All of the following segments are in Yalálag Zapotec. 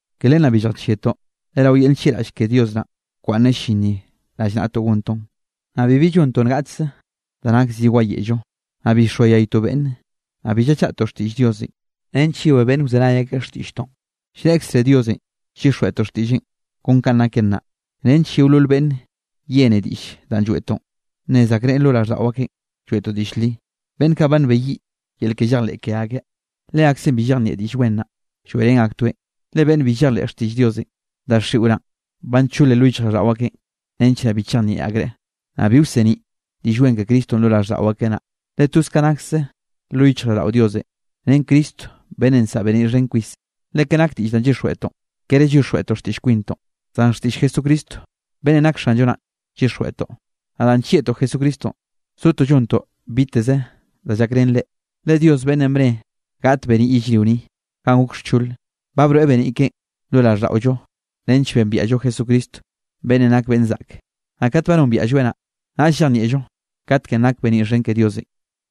Ke len naꞌ bi lljachieꞌtoꞌ, le rao yel nllieꞌraꞌll ke Dios naꞌn bkwaꞌnneꞌ llin ni rallnaꞌtoꞌ gontoꞌn. Naꞌ bibi llontoꞌ ngaꞌchze da nak zi wayeꞌllo, naꞌ bi llxoayaytoꞌ beꞌnne, naꞌ bi llachaꞌtoꞌ xtiꞌll Diosenꞌ nench yewé beꞌnne wzenay akeꞌ xtiꞌlltoꞌn. Llreꞌkze Diosenꞌ llyixjweꞌtoꞌ xtiꞌlleꞌn kon kanꞌ naken naꞌ, nench yeolol beꞌnne yene diꞌll danꞌ lloeꞌtoꞌn, nnez akreꞌ lo raꞌlldaꞌo akeꞌ lloeꞌtoꞌ diꞌll li. Beꞌnn kaꞌ ba nbeyiꞌ yel ke llejleꞌ ke akeꞌ, leakzeꞌn bi llejnieꞌ Diꞌll Wen naꞌ, lloeꞌrén aktoeꞌn. Le beꞌnn bi llejleꞌ xtiꞌll Diosenꞌ, daxiꞌo naꞌ ba ncholen lo yichjraꞌlldaꞌo akeꞌn, nench naꞌ bi chejnieꞌ akreꞌ, naꞌ bi wseniꞌ Diꞌll Wen ke Cristonꞌ lo raꞌlldaꞌo akeꞌ naꞌ, le toz ka nakse lo yichjraꞌlldaꞌo Diosenꞌ ren Cristo beꞌnnenꞌ nsaꞌa beniꞌ xhen kwisenꞌ. Le ka nak diꞌll danꞌ llyixjweꞌtoꞌn, kere llyixjweꞌtoꞌ xtiꞌll kwintoꞌ, zan xtiꞌll Jesucristo beꞌnnenꞌ nak Xanllo naꞌn llyixjweꞌtoꞌ. Naꞌ danꞌ nllieꞌtoꞌ Jesucristonꞌ zotoꞌ llontoꞌ biteze da llakrén reꞌ. Le Dios beꞌnnenꞌ bne gaꞌt beniꞌ yellrio ni ganꞌ gok xchole, ba broeꞌ beniꞌ keꞌen lo raꞌlldaꞌollo nench bembiaꞌllo Jesucristo beꞌnnenꞌ nak beꞌnn zaꞌke, naꞌ kat ba nombiaꞌlloeꞌ naꞌ, naꞌll llejnieꞌllo katkenꞌ nak beniꞌ xhen ke Diosenꞌ.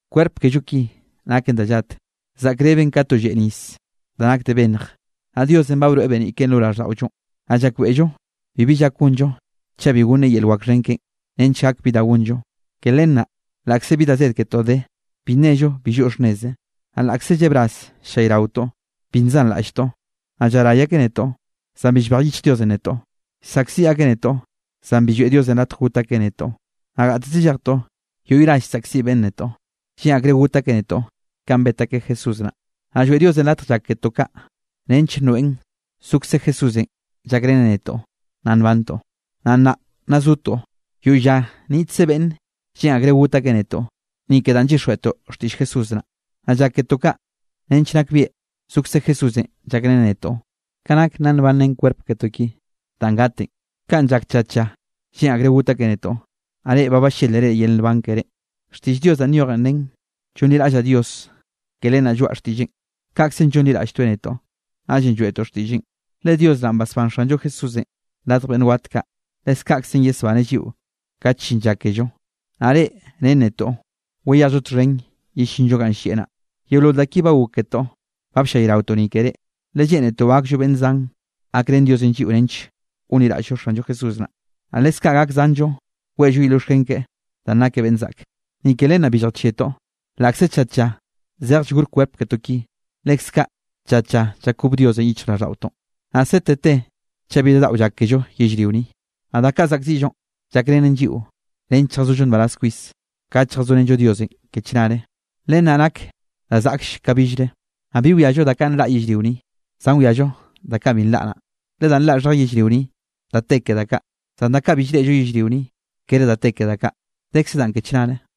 Kwerp kello ki naken da llat, zaꞌkreben ka to lleꞌ nis da nak de bennj. Naꞌ Diosenꞌ ba broeꞌ beniꞌ keꞌen lo raꞌlldaꞌollonꞌ, naꞌ llakbeꞌllo bibi llak gonllo chaꞌ bi gonneꞌ yel wak xhen keꞌen nench gak bi da gonllo. Ke len naꞌ laꞌkze bi da zed ketoꞌ de, bi nello bi lloꞌ xhnneze. Naꞌ laꞌkze llebraz llallayraotoꞌ, bi nzanraꞌlltoꞌ. Naꞌ llaray akeꞌ netoꞌ, zan bi llbej yichj Diosenꞌ netoꞌ. Llsaꞌkziꞌ akeꞌ netoꞌ, zan bi lloeꞌ Diosenꞌ latj got akeꞌ netoꞌ. Naꞌ gateze llejtoꞌ, yoꞌy ras llsaꞌkziꞌ beꞌnne netoꞌ, lleꞌn akreꞌ got akeꞌ netoꞌ kanꞌ bet akeꞌ Jesús naꞌ. Naꞌ lloeꞌ Diosenꞌ latj llak ketoꞌ kaꞌ, nench nroeꞌn zokze Jesúsenꞌ llakreneꞌ netoꞌ nna nbantoꞌ. Naꞌ nnaꞌ nna zotoꞌ, yoꞌy lla niꞌtkze beꞌnn lleꞌn akreꞌ got akeꞌ netoꞌ ni ke danꞌ llyixjweꞌtoꞌ xtiꞌll Jesús naꞌ. Naꞌ llak ketoꞌ kaꞌ nench nakbieꞌ zokze Jesúsenꞌ llakreneꞌ netoꞌ, ka nak nna nbanrén kwerp ketoꞌ ki danꞌ gatenꞌ. Kanꞌ llak tlla tlla lleꞌn akreꞌ got akeꞌ netoꞌ, naꞌ reꞌ ba ballélere yel nban keré. Xtiꞌll Dios danꞌ nyojen nen: “Llonliraꞌllaꞌ Dios, ke len naꞌ lloaꞌa xtiꞌlleꞌn.” Kaꞌkzenꞌ llonliraꞌlltoeꞌ netoꞌ, naꞌllenꞌ lloeꞌtoꞌ xtiꞌlleꞌn. Le Dios naꞌn basbán Xanllo Jesúsenꞌ radj beꞌnn wat kaꞌ, leskaꞌkzenꞌ yesbaneꞌ lliꞌo kat llin lla kello, naꞌ reꞌ ren netoꞌ wayejllo txhen yellinllo ganꞌ llieꞌ naꞌ. Yeolol da ki ba gok ketoꞌ ba bllayraotoꞌ ni ke reꞌ. Le lleꞌnetoꞌ gakllo beꞌnn zan gakrén Diosenꞌ lliꞌo nench gonliraꞌll-llo Xanllo Jesús naꞌ, naꞌ leskaꞌ gak zanllo weꞌllo yel llioxken keꞌe danꞌ nakeꞌ beꞌnn zaꞌke. Ni ke len naꞌ bi lljachieꞌtoꞌ. Laꞌkze tlla tlla zej llgor kwerp ketoꞌ ki, leskaꞌ tlla tlla llakob Diosenꞌ yichjraꞌlldaꞌotoꞌn. Naꞌ sete te chaꞌ bi da daꞌo llak kello yellrio ni. Naꞌ da kaꞌ zaꞌkziꞌllonꞌ llakrenen lliꞌo nench lljazollo nbaraz kwis, kat lljazorenllo Diosenꞌ ke chnare, len naꞌ nak da zaꞌklle ka billre. Naꞌ bi wiallo da kaꞌ nlaꞌ yellrio ni, zan wiallo da kaꞌ bi nlaꞌ naꞌ, le danꞌ nlaꞌ xhej yellrio ni da te ke da kaꞌ, zan da kaꞌ bi llreꞌllo yellrio ni, kere da te ke da kaꞌ, dekze danꞌ ke chnare.